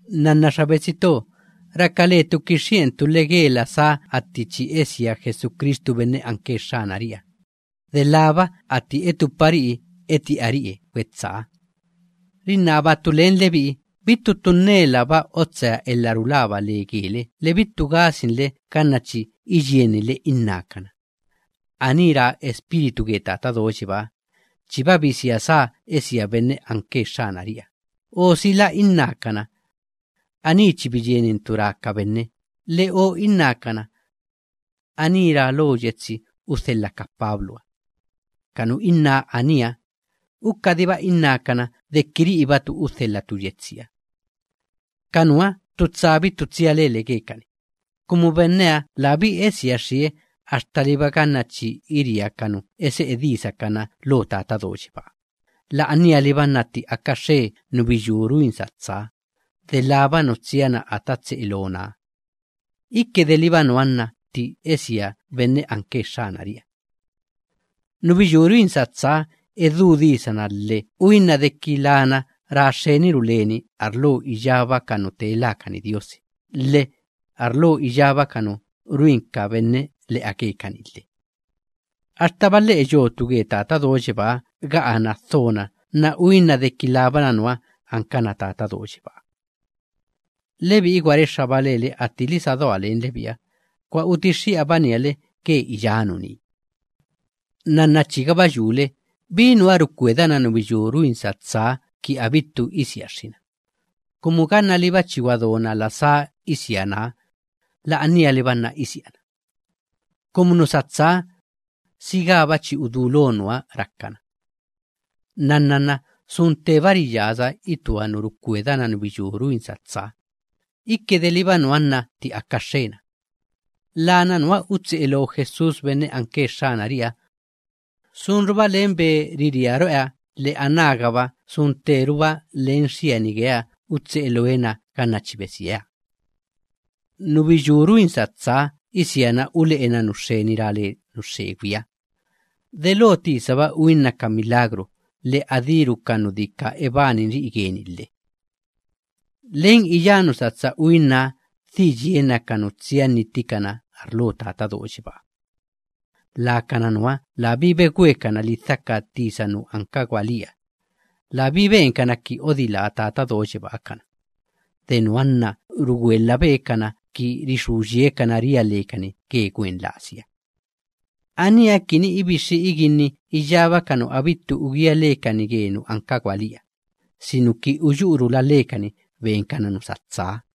Nnanna xa betsi to, raka letu kixxi'entu le ge la sáha atti chi esia Jesucristu benne anke Xxanari'iha, delába atti etupari'i eti'ari'e gwetsáha. Rinnabatu len lebi'i, bittu ttu nnelaba otsea elha rulaba le gele, lhe bittu gasinle ganna chi iyieninle innákana: “Aní ra Espíritu ge Tata Do Yebáha, chiba bisia sá esia benne anke Xxanari'iha” o sila innákana: “Aní chi biyienintu ra ka benne”, lhe o innákana: “Aní ra lo yetsi udhelha ka Pabluha.” Ka nu inná aníha, ukadiba innákana deki ri'ibatu udhelhatu yetsiha. Ka nuha, ttu tsa bittu tsia lele gekani, kumu benneha labí esiaxxie axtaliba ganna chi iria ka nu ese'e disakana lo Tata Do Yebáha, la'anialiba nna tti aka xxe nubiyú ruin satsaha, delába nu tsiana ata tse'e loonaha. Iki deliba nuha nna tti esia benne anke Xxanari'iha. Nubiyú ruin satsaha, edú disana lhe uinna deki lana ra xxeniru leni arlo iyába ka nu tee lákani diosi, lhe arlo iyába ka nu ruin ka benne le'a gekani lhe. Axtaba lhe'e yotu ge Tata Do Yebáha ga'anna dhona nna uinna deki labana nuha ankana Tata Do Yebáha. Lebi'i gwa rexxaba lele attili sa doa len lebi'iha, gwa utixxi'abania le ge iyá nuní. Nnanna chigaba yule bí nuha rukwedana nubiyú ruin satsaha kini abittu isiaxxina, kumu gannaliba chi gwadona la sá isianaha, la'anialiba nna isiana. Kumu nu satsaha, sigába chi udulo nuha rakana. Nnanna nna sun tteba riyasa itua nu rukwedana nubiyú ruin satsaha, iki deliba nuha nna tti aka xxena. Lana nuha utse'e loo Jesús benne anke Xxanari'iha na, sunruba len be iria ro'eha, lhe anágaba sun tteruba len xiani geeha utse'e looe na ganna chi besieha. Nubiyú ruin satsaha isiana ule'ena nu xxeni ra le nu xxegwiha, delo tisaba uinna ka milagru lhe adíru ka nu dika ebaninri'i geni lhe. Len iyá nu satsa uinnaha dhi yiena ka nu tsia nnittikana arlo Tata Do Yebáha. Lakana nuha labí begwekana lidhaka tisa nu anka gwalíha, labí benkana ki odilá Tata Do Yebáha kana. De nuha nna rugwelhabe kana kini rixú yiekana ria lekani ge gwen lasiha. Aníha kini ibixxi iginni iyába ka nu abittu ugía lekani ge nu anka gwalíha, sinuki uyu'urula lekani benkana nu satsaha.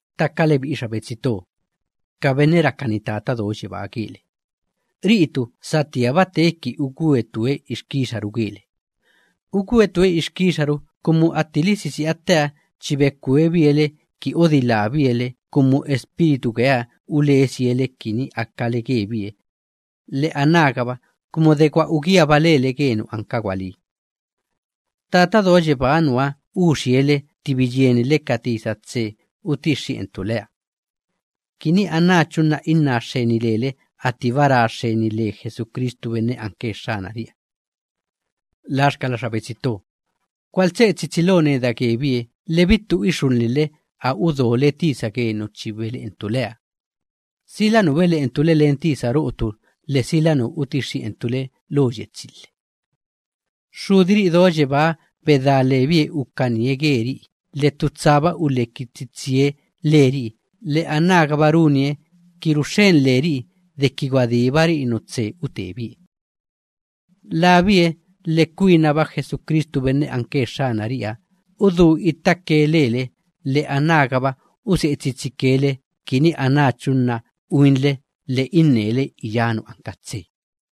Ttaka lebi'i xa betsi to, ka benne rakani Tata Do Yebáha gele, ri'itu satíaba teeki ugwetue ixkixaru gele. Ugwetue ixkixaru, kumu ttili sisi'a tteha chi bekwebie le ki odilábie le, kumu Espíritu geeha ulesie le kini akale gebie lhe anágaba kumu de gwa ugíaba lele ge nu anka gwalí. Tata Do Yebáha nuha uxie le tti biyieninle ka tisa tse utixxi'entu leha, kini anáchu nna inná xxeni lele attiba ra xxeni le Jesucristu benne anke Xxanari'iha. Laxkala xa betsi to, gwaltse'e tsitsi lo neda gebie lhe bittu ixulhinle a udole tisa ge nu chi bele'entu leha, sila nu bele'entu le len tisa ro'otu, lhe sila nu utixxi'entu le lo yetsi lhe. Xxudiri'i do yebáha bedá lebie ukanie geri'i lhe ttu tsaba uleki tsitsie leri'i lhe, anágaba runie kini ruxxen leri'i deki gwadíbari'i nu tse utebie. Labie lhe kwinaba Jesucristu benne anke Xxanari'iha udú ittake lele, lhe anágaba use'e tsitsike le kini anáchu nna uinle lhe innele iyá nu anka tse lhe.